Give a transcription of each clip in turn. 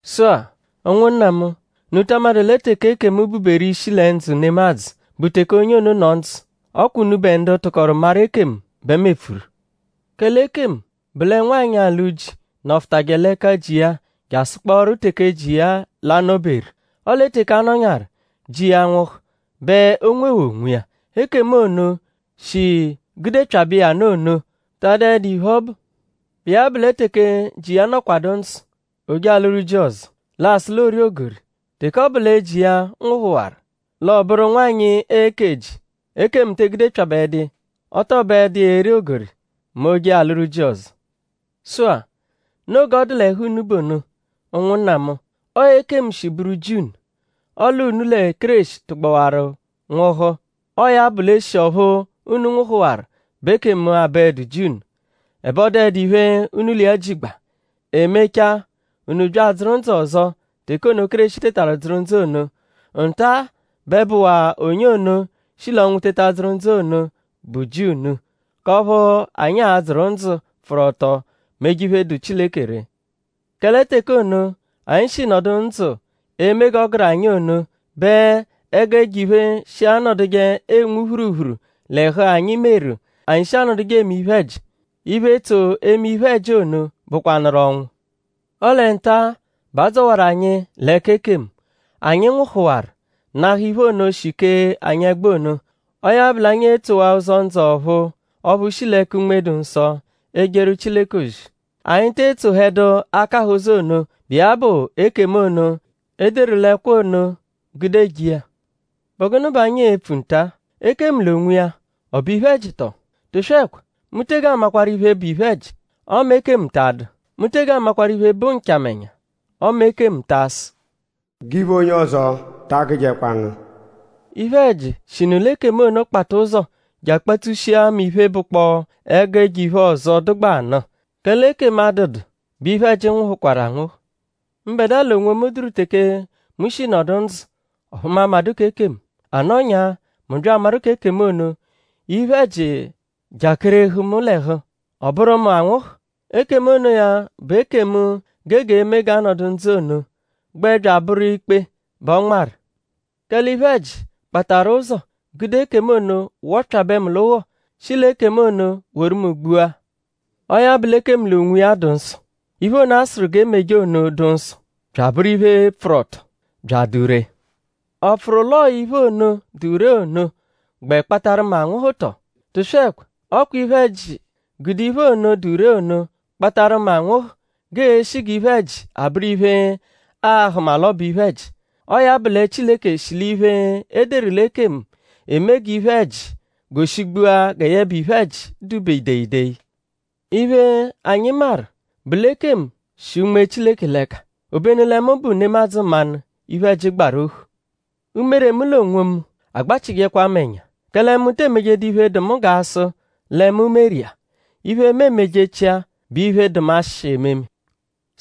Sụ-a; ụnwunna mu;?unu ta amadụ lẹ teke ekemu bụ-beru ishi lẹ ndzụ nemadzụ bụ teke onye ono nọ ndzụ? Ọ kwa unubẹ ndu tụkoru maru ekemu bẹ mu epfuru. Kẹle ekemu bụ lẹ nwanyị, alụ ji nọfutaje l'ẹka ji iya jasụkporu teke ji iya l'a-nọ-beru. Ọle teke a nọnyaaru; ji iya nwụhu bẹ o nwewaa onwiya. Ekemu ono, shi gudepyabẹ iya nụ ono ta adụedu iphe, ọ bụ. Bụ iya bụ lẹ teke ji iya nọkwadu ndzụ; o je alụru ji ọzo; l'aasụ l'oori ogori; teke ọ bụ lẹ ji iya nwụhuwaru; l'ọ bụru nwanyị eke ji. Ekemu te egudepyabẹdu iya. Ọ tọ bụedu iya eri ogori mẹ o -je alụru ji ọzo. Sụ-a; noo g'ọ dụ l'ẹhu unu bụ ono; ụnwunna mu. Ọo ekemu shi bụru ji unu; ọle unu lẹ Kéreshi tụgbawaru nwụhu. Ọo ya bụ l'eshi ọphu unu nwụhuwaru bẹ ekemu abụedu ji unu. Ẹbe ọ dụedu iphe, unu l'iya jigba. E mechaa; unu bya adzụru ndzụ ọzo teke ono, Kéreshi tetaru dzụru ndzụ ono. Nta-a, bẹ bụwaa onye ono, shi l'ọnwu teta dzụru ndzụ ono bụ ji unu; k'ọphu anyi a-dzụru ndzụ, pfụru ọto meje iphe, dụ Chileke ree. Kẹle teke ono, anyi shi nọdu ndzụ eme g'ọ gụru anyi ono bẹ ẹgu ẹjo-iphe, shi anọduje enwu phuruphuru l'ẹhu anyi meru anyi shi anọduje eme iphe-ẹji. Iphe, tso eme iphe-ẹji ono bụkwanuru ọnwu. Ọle nta-a bẹ a dzọwaru anyi l'ẹka ekemu. Anyi nwụhuwaru; nahụ iphe ono, shi kee anyi ẹgbu ono. Ọo ya bụ l'anyi etsowaa ụzo ndzụ ọ̀phúú ọphu shi l'ẹka Unme-dụ-Nsọ ejeru Chileke ozi. Anyi te etsohẹdu akahụ ụzo ono, bụ iya bụ ekemu ono, e deru l'ẹkwo ono gude eje iya. ?Bụ gụnu bẹ anyi e-pfu nta? Ekemu l'onwiya?ọ bụ iphe-ẹji tọo? Tụswekwa! Mu tege amakwaru iphe, bụ iphe-ẹji; ọme ekemu ta adụ. Mu tege amakwaru iphe, bụ nchamẹnya ọme ekemu ta asụ: “G'iphe onye ọzo ta agụjekwa ngu.” Iphe-ẹji shinu l'ekemu ono kpata ụzo je akpatsushia mu iphe, bụkpoo ẹgu ẹjo-iphe ọzo, dụgbaa nụ. Kẹle ekemu -adụdu bẹ iphe-ẹji nwụhukwaru anwụhu. Mbẹdua l'onwomu dụru teke mu shi nọdu ndzụ; ọphu mu amadụ k'ekemu. A nọnyaa mu bya amaru k'ekemu ono; iphe-ẹji jakerehu mu l'ẹhu; ọ bụru mu anwụhu. Ekemu onoya bụ ekemu, gege eme g'a nọdu ndzụ ono gbẹ bya abụru ikpe bẹ ọ nmarụ. Kẹle iphe-ẹji kpatarụ ụzo; gude ekemu ono wọpyabe mu l'ụgho; shi l'ekemu ono woru mu gbua. Ọo ya bụ l'ekemu l'onwiya dụ nsọ. Iphe ono, a sụru g'e meje ono dụ nsọ; bya abụru iphe, pfụru ọto; bya adụ ree. ?Ọ pfụru l'ọo iphe ono, dụ ree ono gbẹ kpatarụ mu anwụhu tọ? Tụswekwa! Ọ kwa iphe-ẹji gude iphe ono, dụ ree ono kpatarụ mu anwụhu g'ee-shi g'iphe-ẹji abụru iphe, aa-hụma l'ọ bụ iphe-ẹji. Ọo ya bụ lẹ Chileke shi l'iphe, e deru l'ekemu eme g'iphe-ẹji goshigbua gẹ yẹbe iphe-ẹji dụ-be ideyideyi. Iphe, anyi maru bụ l'ekemu shi Unme Chileke l'ẹka; obenu lẹ mu bụ nemadzụ mmanụ, iphe-ẹji gbaru ohu. Umere mu l'onwomu agbachịjekwa mu ẹnya; kẹle mu te emejedu iphe, dụ mu g'a sụ lẹ mu meru iya. Iphe, mu emejechia bụ iphe, dụ mu ashị ememe.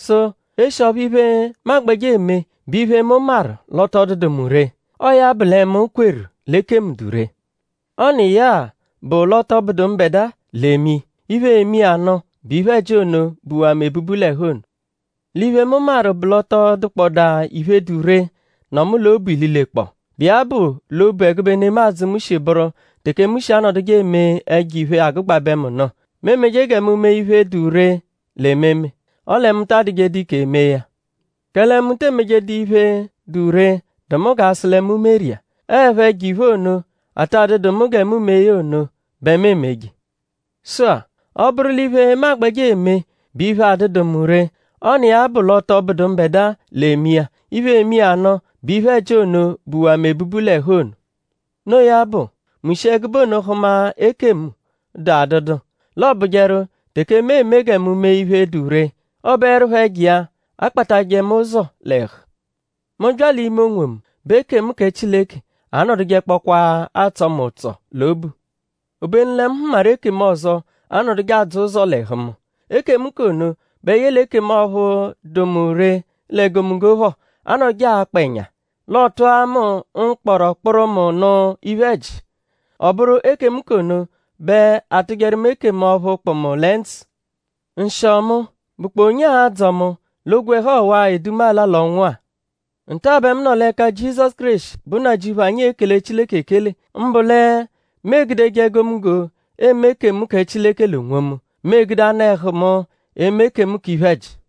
Sụ eshi ọphu iphe, mu agbẹje eme bụ iphe, mu maru l'ọ tọ dụdu mu ree; ọo ya bụ lẹ mu kweru l'ekemu dụ ree. Ọ n'iya-a bụ l'ọ tọ bụdu mbẹdua l'eme iya. Iphe, eme iya nụ bụ iphe-ẹji ono, buwaa mu ebubu l'ẹhu ono. L'iphe, mu maru bụ l'ọ tọ dụkpodaa iphe, dụ ree, nọ mu l'obu ililekpọo, bụ iya bụ l'obu ẹgube nemadzụ, mu shi bụru teke mu shi anọduje eme ẹjo-iphe, agụgbabe mu nụ. Mu emeje gẹ mu mee iphe, dụ ree l'ememe; ọle mu ta adụjedu ike mee ya. Kẹle mu te emejedu iphe, dụ ree, dụ mu g'a sụ lẹ mu meru iya. Ọo 'ẹpho ẹjo-iphe ono, ata dụdu mu gẹ mu mee ya ono bẹ mu emeje. Sụ-a; ọ -bụru l'iphe, mu agbẹje eme bụ iphe, adụdu mu ree; ọ n'iya bụ l'ọ tọ bụdu mbẹdua l'eme iya. Iphe, eme iya nụ bụ iphe-ẹji ono, buwaa mu ebubu l'ẹhu ono. Noo ya bụ; mu shi ẹgube ono hụma ekemu, dụ adụdu; l'ọ bụjeru; teke mu eme gẹ mu mee iphe, dụ ree; ọ bụerupho ẹjo iya akpatajẹ mu ụzo l'ẹhu. Mu -bya l'ime onwomu bẹ ekemu kẹ Chileke anọdujekpokwaa atsọ mu ụtso l'obu. Obenu lẹ mu hụmaru ekemu ọzo, anọduje adzọ ụzo l'ẹhu mu. Ekemu k'ono bẹ yẹle ekemu ọphu dụ mu ree l'egomunggo phọ anọduje akpa ẹnya. L'ọ tụa mu mkpọro kpụru mu nụ iphe-ẹji. Ọ bụru ekemu k'ono bẹ aatụjeru mu ekemu ọphu kpụ mu lẹ ndzụ. Nshịo mu!?Bụkpoo onye a-dzọ mu l'ogwẹhu ọwa-a, edu mu ala l'ọnwu-a? Nta bẹ mu nọ l'ẹka Jizọsu Kéreshi, bụ Nnajịuphu anyi ekele Chileke ekele. Mbụ lẹ mu egudeje egomunggo eme ekemu kẹ Chileke l'onwomu; mu egude anụ-ẹhu mu eme ekemu k'iphe-ẹji.